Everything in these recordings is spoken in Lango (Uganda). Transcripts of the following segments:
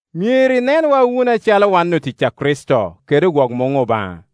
Myero inenwa wunu acalo wan otic a Kricito, kede ogwok muŋ Obaŋa.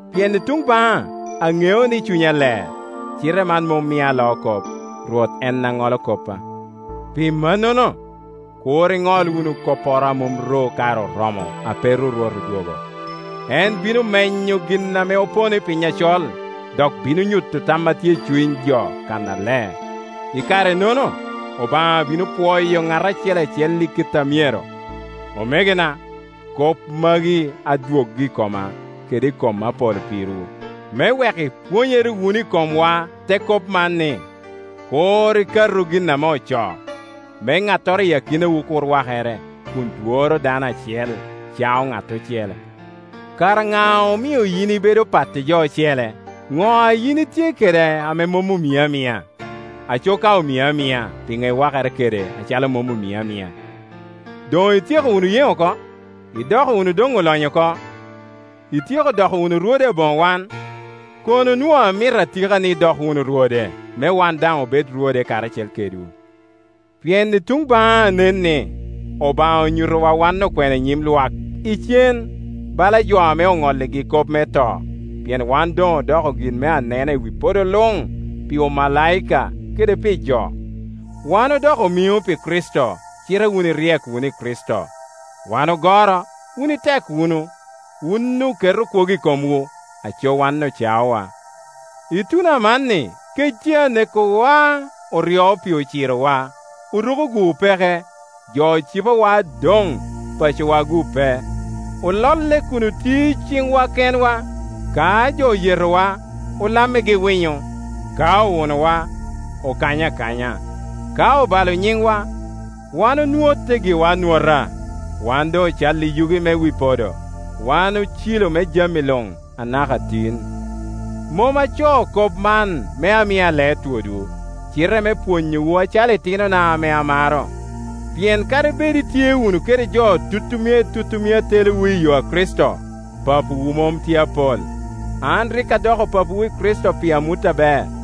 Pien i tuŋ baŋa aŋeo ni cunya ler, cite man mom mia aloo kop. Rwot en a ŋolo koppa. Pi mannono, kur iŋol wunu kopporo a mom ru kare oromo, ape ru Rwot odwogo. En bino menyo gin ame opono i piny acol, dok bino nyuto tam a tye i cuny jo kannaler. I kare-nono Obaŋa bino pwoyo ŋat acel acel i kite a myero. Omegona, kop magi adwoggo i i koma kede i kom Apolo pirwu, me wek ipwonyere wunu i komwa te kop man, ni, “Kur ikatu gin ame ocoo”, me ŋattoro i akinawu kur wakere, kun dworo dano acel, cao ŋat ocele. Kara ŋa omio yin ibedo pat i jo ocele. Ŋo a yin itye kede a mom omii amia? Aco ka omii amia, pi ŋo iwakere kede acalo mom omii amia? Doŋ ityeko wunu yeŋ oko? Idoko wunu doŋ olonyo oko? Ityeko doko wunu rwode aboŋo wan? Kono onwoŋo amito atika ni idok wunu rwode, me wan daŋ obed rwode karacel kedwu. Pien i tuŋ baŋa nen ni, Obaŋa onyutowa wan okwena i nyim lwak icen, bala jo ame oŋolligi kop me to; pien wan doŋ odoko gin me anena pi wi podo luŋ, pi omalaika kede pi jo. Wan odoko omiŋo pi Kricito, cite wun iryek wunu i Kricito. Wan ogoro, wun itek wunu. Wun oketo kwogo i komwu, aco wan ocaowa. Ituno amanni kec tye anekowa, oryo pii acirowa, oruko-gu opeke, jo cipowa adoŋ, pacowa-gu pe; ololle kun otio i ciŋwa kenwa. Ka jo oyetowa, olammigi winyo, ka owunowa, okanyo akanya; ka obalo nyiŋwa, wan onwotte giwa anwota. Wan doŋ ocalli yugi me wi podo, wan ocilo me jami luŋ, anaka tin. Mom acoo kop man me ami alee twodwu, cite me pwonyowu acalo itinona ame amaro. Pien kadi bed itye wunu kede jo tutumia i tutumia a telowu i yo a Kricito, papawu mom tye apol. An rik adoko papawu i Kricito pi amut aber.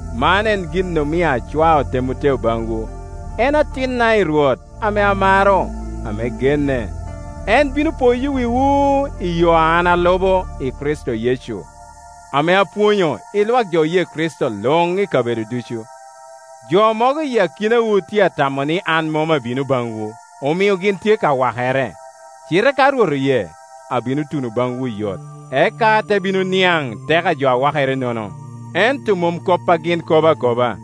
Man en gin omio acwao Temoteo baŋwu. En atinna i Rwot ame amaro, ame genne. En bino poyo wiwu i yo a an alubo i Kricito Yecu, ame apwonyo i lwak jo oye Kricito luŋ i kabedo ducu. Jo mogo i akinawu tye atamo ni an mom abino baŋwu, omio gin tye ka wakere. Cite ka Rwot oye, abino tuno baŋwu oyot, eka ate bino niaŋ te ko a jo a wakerenono, ento mom kop a gin kobo akoba.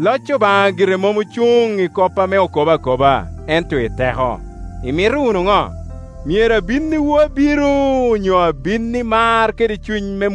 Loc Obaŋa gire mom ocuŋ i kop ame okobo akoba ento i teko. Imito wunu ŋo? Myero abinniwu abiro onyo abin i mar kede cuny